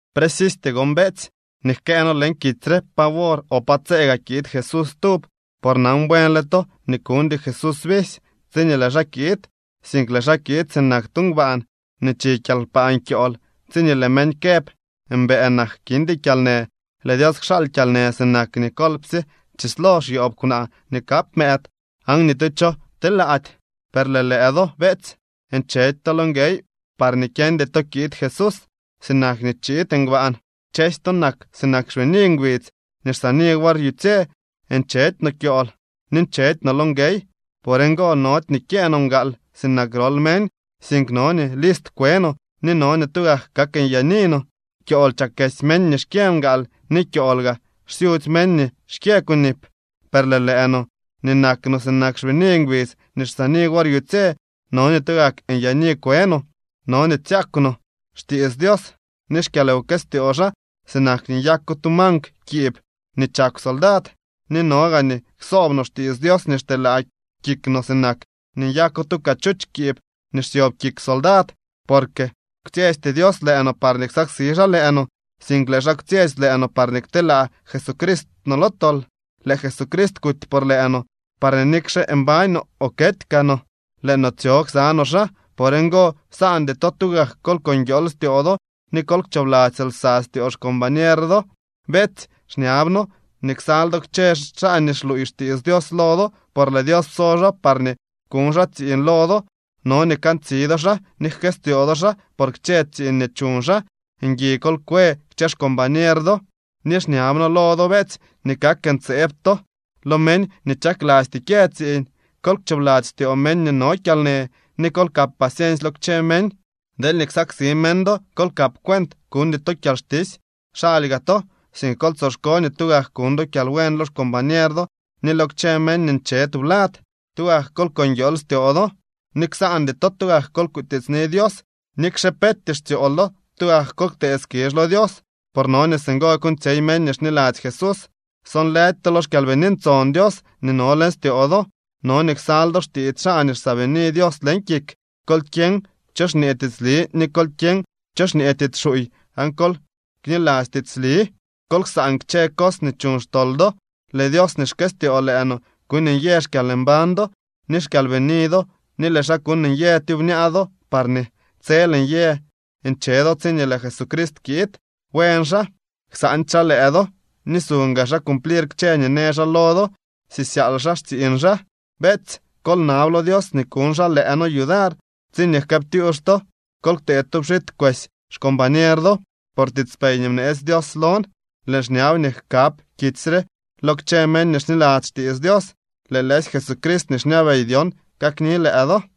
Precisty gon, beetsy, nii jkëë noo leñ kitsy re pa wor o pa tsee gaa kiid Jesús stub. Por nan buenle to nii kuñdy Jesús visy tsiñee lëë xaa kiid, sink lëë xaa kiid sinak tu ngbaan nii chi kyalkpaan kyool. Tsiñee lëë meñ këb: “Mbëë nak, kindy kyalnë”, lëë Dios kxaal kyalnë sinak nii kolpsye chislo xyoob kwnaa nii kap mëëd, aan ni tu cho telaady. Per lëë lëë do, beetsy, nchedy to lo nguey parñee kyeñdy to kiid Jesús sinak nii chiid ngbaan. Kchësy to nak sinak xbini ngbidz nii xsaani wor yutsye. Nchedy no kyool ni nchedy no lo nguey. Por ngo nody nii kyëë no mgaal sinak grol meñ, sink no nii list kwe no ni no nii tugak kak nyaani no. Kyool chakesy meñ nii xkyë mgaal ni kyool gaa xsyutsy meñ nii xkyë kunip. Per lëë lëë no, nii nak no sinak xbini ngbidz nii xsaani wor yutsye, no nii tugak nyaani kwe no. No nii tsyakw no xtiits Dios ni xkyalwkëstyoo xaa sinak nii nyako tu mankw kiib nii chakw soldad, ni no gaa nii ksoob no xtiits Dios nii xteelaa kik no sinak nii nyako tu cachuch kiib nii xsyob kik soldad. Porque kwtsyesty Dios lëë no parñee ksaksi xaa lëë no, sink lëë xaa kwtsyetsy lëë no parñee kteelaa Jesucrist no lo tol. Lëë Jesucrist kuty por lëë no, parñee nikxe mbañ no o kety kaa no lëë no tsyo ksa no xaa. Por ngo, ksaandy to tugak kol ko nguiool styoo do ni kol kchoobladzy lsa styoo xcombañer do. Beetsy, xñab noo nii ksal do kchë xaa nii xluuy xtiits Dios lo do, por lëë Dios pso xaa parñee kuñ xaa tsiiñ lo do. No nii kantsi do xaa ni jkëstyoo do xaa por kchë tsiiñ nii chuñ xaa. Ngui kol kwe kchë xcombañer do. Ni xñab noo lo do, beetsy, nii kak ntseeb to lo meñ nii chaklasty kyë tsiiñ. Kol kchoobladzy styoo meñ nii no kyalnë, ni kol kap paciensy lo kchë meñ. Deelñee ksaksi meñ do, kol kap cuent kuñdy to kyalxtisy xaly gaa to, sink kol tsoxko nii tugak kuñ do kyalbuen lo xcombañer do ni lo kchë meñ nii nche tublad. Tugak kol ko nguiool styoo do. Ni ksaandy to, tugak kol kutiitsni Dios. Nikxe peetyee xtsyool do tugak kol ktee skizh lo Dios, por no nii singo kuuñtsyey meñ nii xniladzy Jesús. Sonlëdy to lo xKyalbini Ntson Dios nii no leñ styoo do. No nii ksal do xtiits xaa nii xsaabini Dios leñ kik. Kol kyeñ cho xñee tiitsli ni kol kyeñ cho xñee tiits xuuy aan kol kniladzy tiitsli. Kol ksaan kchë cos nii chuñ xtol do. Lëë Dios nii xkëstyoo lëë no kuuñ nyë xkyalmbañ do ni xkyalbini do ni lëë xaa kuuñ nyë tyubñaa do parñee tsel nyë nche do tsiñee lëë Jesucrist kiid. Buen xaa, ksaandy xaa lëë do, ni suñ gaa xaa cumplir kchë nii në xaa lo do, sisyaal xaa xtsiiñ xaa. Beetsy, kol nab lo Dios nii kuñ xaa lëë noo yudar. Tsiñee jkëëptyux to, kol ktee tu pxit kwesy xcombañer do. Por tiitspey nii bneetsy Dios lon, lëën xñab nii jkab kitsy re lo kchë meñ nii xniladzy xtiits Dios. Lëë lëësy Jesucrist nii xñabey dyon kakni lëë do.